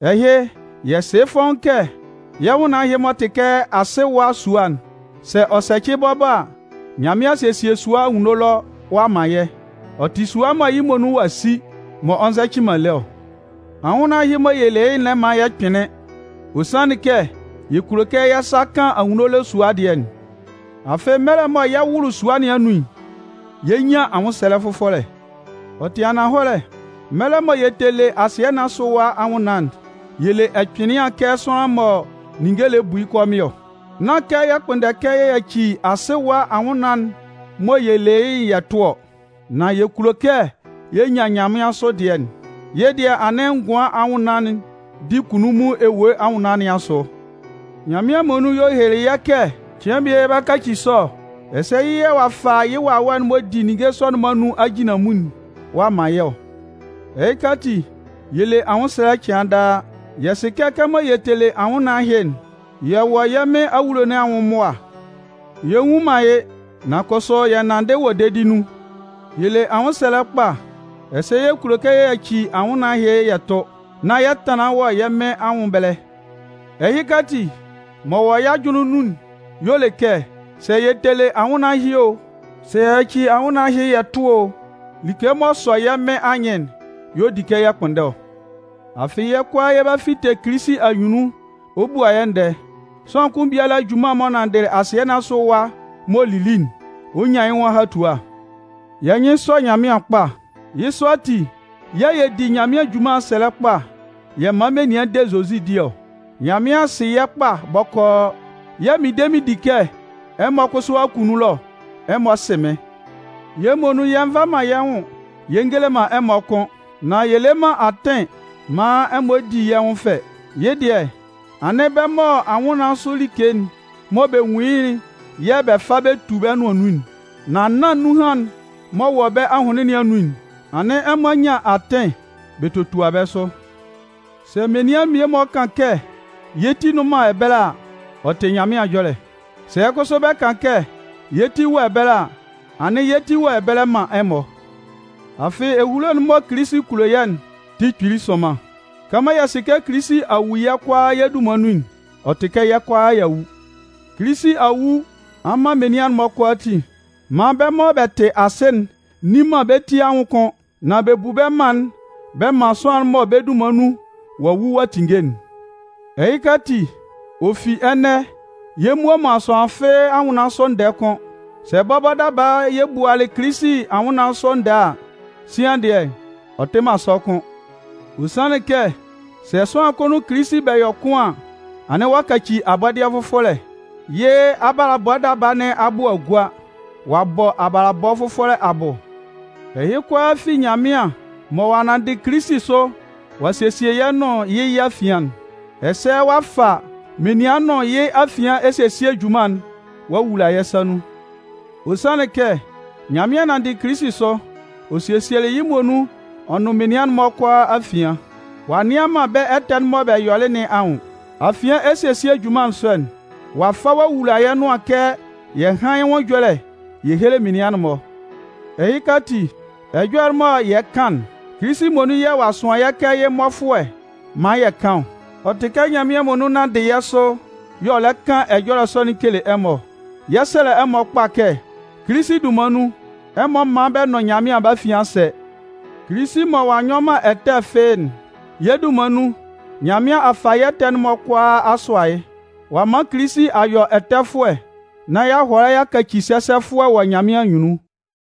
Ɛhɩ, yɛ sɩ yɩ́ fɔ́ʋ́n kɛ yɛ́ nwʋnnaan ɛhɩ m'ɔ tɩ kɛ asɩ ɛwa sua'n, sɛ ɔ sɛcɩ bɔbɔ a, Nyanmɩan a sesie sua anwunno ɛlɔ ɔ'a man yɛ́. Ɔ tɩ sua mɔ yɩ́ muonun ɔ'a si, m'ɔ nzɛcɩ man lé ɔ. Anwʋnnaan ɛhɩ mɔ yɛ le yɩ́'n lɛ man yɛ kpɩnlɩn. Ɔ sanlɩn kɛ yɛ kulo kɛ yɛ́ sa kan anwunno ɛlɔ sua dɩɛ'n. Afɩ, mɛlɛ mɔ yɛ 'wʋlʋ sua sɔ nɩn anun'n, yɛ 'nyan anwʋnnaan fʋfɔlɛ. Ɔ tɩ ananhɔlɛ, mɛlɛ mɔ yɛ tɛ le asɩɛ nɩn asʋ ɛwa anwʋnnaan'n, yɛ le ɛkpɩnlɩan kɛ sʋanlan mɔ ninnge lɛ bu yɩ́ kɔmɩn ɔ. Nán kɛ yɛ kpʋnndɛ kɛ yɛ yaci asɩ ɛwa anwʋnnaan'n mɔ yɛ le yɩ́'n yɛ tʋ ɔ, nan yɛ kulo kɛ yɛ nyan nyanmɩansʋ dɩɛ'n. Yɩ́ dɩɛ anɩn ngʋan anwʋnnaan'n di kunnunmun ewue anwʋnnaan nɩn asʋ. Nyanmɩan muonun y'ɔ helelɩ yɛ́ kɛ cɩan bie yɛ 'ba kaci sɔ ɔ. Ɛsɛ yɩ́ yɛ̂ ɔ'a fa yɩ́ Wawɛ'n m'ɔ di ninnge sɔ'n-mɔ anun ajinlanmun'n ɔ'a man yɛ́ ɔ. Ɛhɩka ati, yɛ le anwʋnsɛlɛ cɩan daa. Yɛ sɩ kɛ kɛmɔ yɛ tɛ le anwʋnnaan ɛhɩ'n, yɛ wɔ yɛ́ Mɩn awulo nɩn anwʋn mʋa. Yɛ́ nnwun man yɩ́, nan kʋsʋ yɛ nanndɩ wɔ dedi nun. Yɛ le anwʋnsɛlɛ kpa ɛsɛ yɛ kulo kɛ yɛ yaci anwʋnnaan ɛhɩ yɛ tʋ, nán yɛ tanlan wɔ yɛ́ Mɩn anwʋn ɛbɛlɛ. Ɛhɩka ati, m'ɔ wɔ yɛ́ ajʋnlɩn nun'n y'ɔ le kɛ sɛ yɛ tɛ le anwʋnnaan ɛhɩ o, sɛ yɛ yaci anwʋnnaan ɛhɩ yɛ tʋ o, like m'ɔ sɔ yɛ́ Mɩn anyɩn'n y'ɔ di kɛ yɛ kpʋnndɛ ɔ. Afɩ yɛ́ kʋalaa yɛ 'ba fite Kilisi anyunnun ɔ bua yɛ́ ndɛɛ. Sʋanlan kʋn biala junman'n m'ɔ nanndɩ asɩɛ nɩn asʋ ɛwa m'ɔ lili'n, ɔ 'nyan yɩ́ nwʋn ahatua. Yɛ́ nyɩn sɔ Nyanmɩan kpa. Yɩ́ sɔ ati yɛ̂ yɛ di Nyanmɩan junman'n sɛlɛ kpa yɛ man menian de Zozi di ɔ. Nyanmɩan sɩ yɛ́ kpa bɔkɔɔ, yɛ̂ mɩn de mɩn di kɛ ɛmɔ kʋsʋ akunnun ɛlɔ ɛmɔ sɩ mɩ́n. Yɛ́ muonun yɛ nva man yɛ́ nwʋn yɛ ngele man ɛmɔ kʋ́n. Nan yɛ lɛ man atɩn maan ɛmɔ di yɛ́ nwʋn fɛ. Yɩ́ dɩɛ, anɩn bɛ́ mɔ anwʋnnaan sʋ like'n mɔ bɛ nwun yɩ́'n yɛ̂ bɛ fa bɛ tu bɛ nʋan nun, nan nán nunhan'n m'ɔ wɔ bɛ́ ahʋnlɩn nɩn anun'n, anɩn ɛmɔ nyan atɩn bɛ totua bɛ́ sʋ. Sɛ menian mmie-mɔ kan kɛ yɛ́ ti nnʋn man ɛbɛlɛ a, ɔ tɩ Nyanmɩan ɛjɔlɛ. Sɛ kʋsʋ bɛ kan kɛ yɛ́ ti wɔ ɛbɛlɛ a, anɩn yɛ́ ti wɔ ɛbɛlɛ man ɛmɔ. Afɩ ehulo'n mɔ Kilisi kulo yɛ́'n tɩ kpili sʋnman. Kɛmɔ yɛ sɩ kɛ Kilisi a wu yɛ́ kʋalaa yɛ́ dunman nun'n, ɔ tɩ kɛ yɛ́ kʋalaa y'a wu. Kilisi a wu a man menian'n-mɔ kʋalaatin maan bɛ́ mɔ bɛ tɩ asɩ'n nni man bɛ ti anwʋn kʋ́n, nan bɛ bu bɛ́ mân'n bɛ man sʋanlan'n mɔ bɛ́ dunman nun ɔ'a wu ɔ'a tinnge'n. Ɛhɩka ati, ɔ fi ɛnɛ, yɛ mmua man sʋanlan fɩ́ɩ́ anwʋnnaan sʋ ndɛɛ kʋ́n. Sɛ bɔbɔ daba yɛ bualɩ Kilisi anwʋnnaan sʋ ndɛɛ a, sian dɩɛ, ɔ tɩ man sɔ kʋ́n. Ɔ sanlɩn kɛ sɛ sʋanlan kʋn nʋn Kilisi bɛ yɔ kʋn an, anɩn ɔ'a kaci abɔdɩɛ fʋfɔlɛ. Yɩ́ abalabɔ daba nɩn abʋ a gua. Ɔ'a bɔ abalabɔ fʋfɔlɛ abʋ. Ɛhɩ kʋalaa fi Nyanmɩan mɔ ɔ'a nanndɩ Kilisi sʋ ɔ'a sesie yɛ́ nʋn yɩ́ yɛ́ afian'n. Ɛsɛ ɔ'a fa menian nʋn yɩ́ afian esesie junman'n ɔ'a wula yɛ́ sa nun. Ɔ sanlɩn kɛ Nyanmɩan nanndɩlɩ Kilisi sʋ, ɔ sesielɩ yɩ́ muonun ɔ nʋn menian'n-mɔ kʋalaa afian, ɔ'a nnɩan man bɛ́ ɛtɛ'n mɔ bɛ yɔlɩ nɩn anwʋn. Afian esesie junman sɔ'n, ɔ'a fa ɔ'a wula yɛ́ nʋan kɛ yɛ hán yɩ́ nwʋn ɛjɔlɛ yɛ héle menian'n-mɔ. Ɛhɩka ati, ɛjɔlɛ'n mɔ yɛ kan'n, Kilisi muonun yɛ̂ ɔ'a sʋan yɛ́ kɛ yɩ́ mmɔfʋɛ maan yɛ kan ɔ. Ɔ tɩ kɛ Nyanmɩan muonun nanndɩ yɛ́ sʋ y'ɔ lɛ kan ɛjɔlɛ sɔ'n kele ɛmɔ ɔ. Yɛ 'sɛlɛ ɛmɔ kpa kɛ, Kilisi dunman nun, ɛmɔ mán bɛ nʋn Nyanmɩan bɛ́ afian sɛ́! Kilisi mɔ ɔ'a nyɔ man ɛtɛ fɩ́ɩ́'n, yɛ́ dunman nun, Nyanmɩan a fa yɛ́ ɛtɛ'n-mɔ kʋalaa a sʋa yɩ́, ɔ'a man Kilisi a yɔ ɛtɛfʋɛ nán y'a hʋala y'a kaci sɛsɛfʋɛ wɔ Nyanmɩan anyunnun.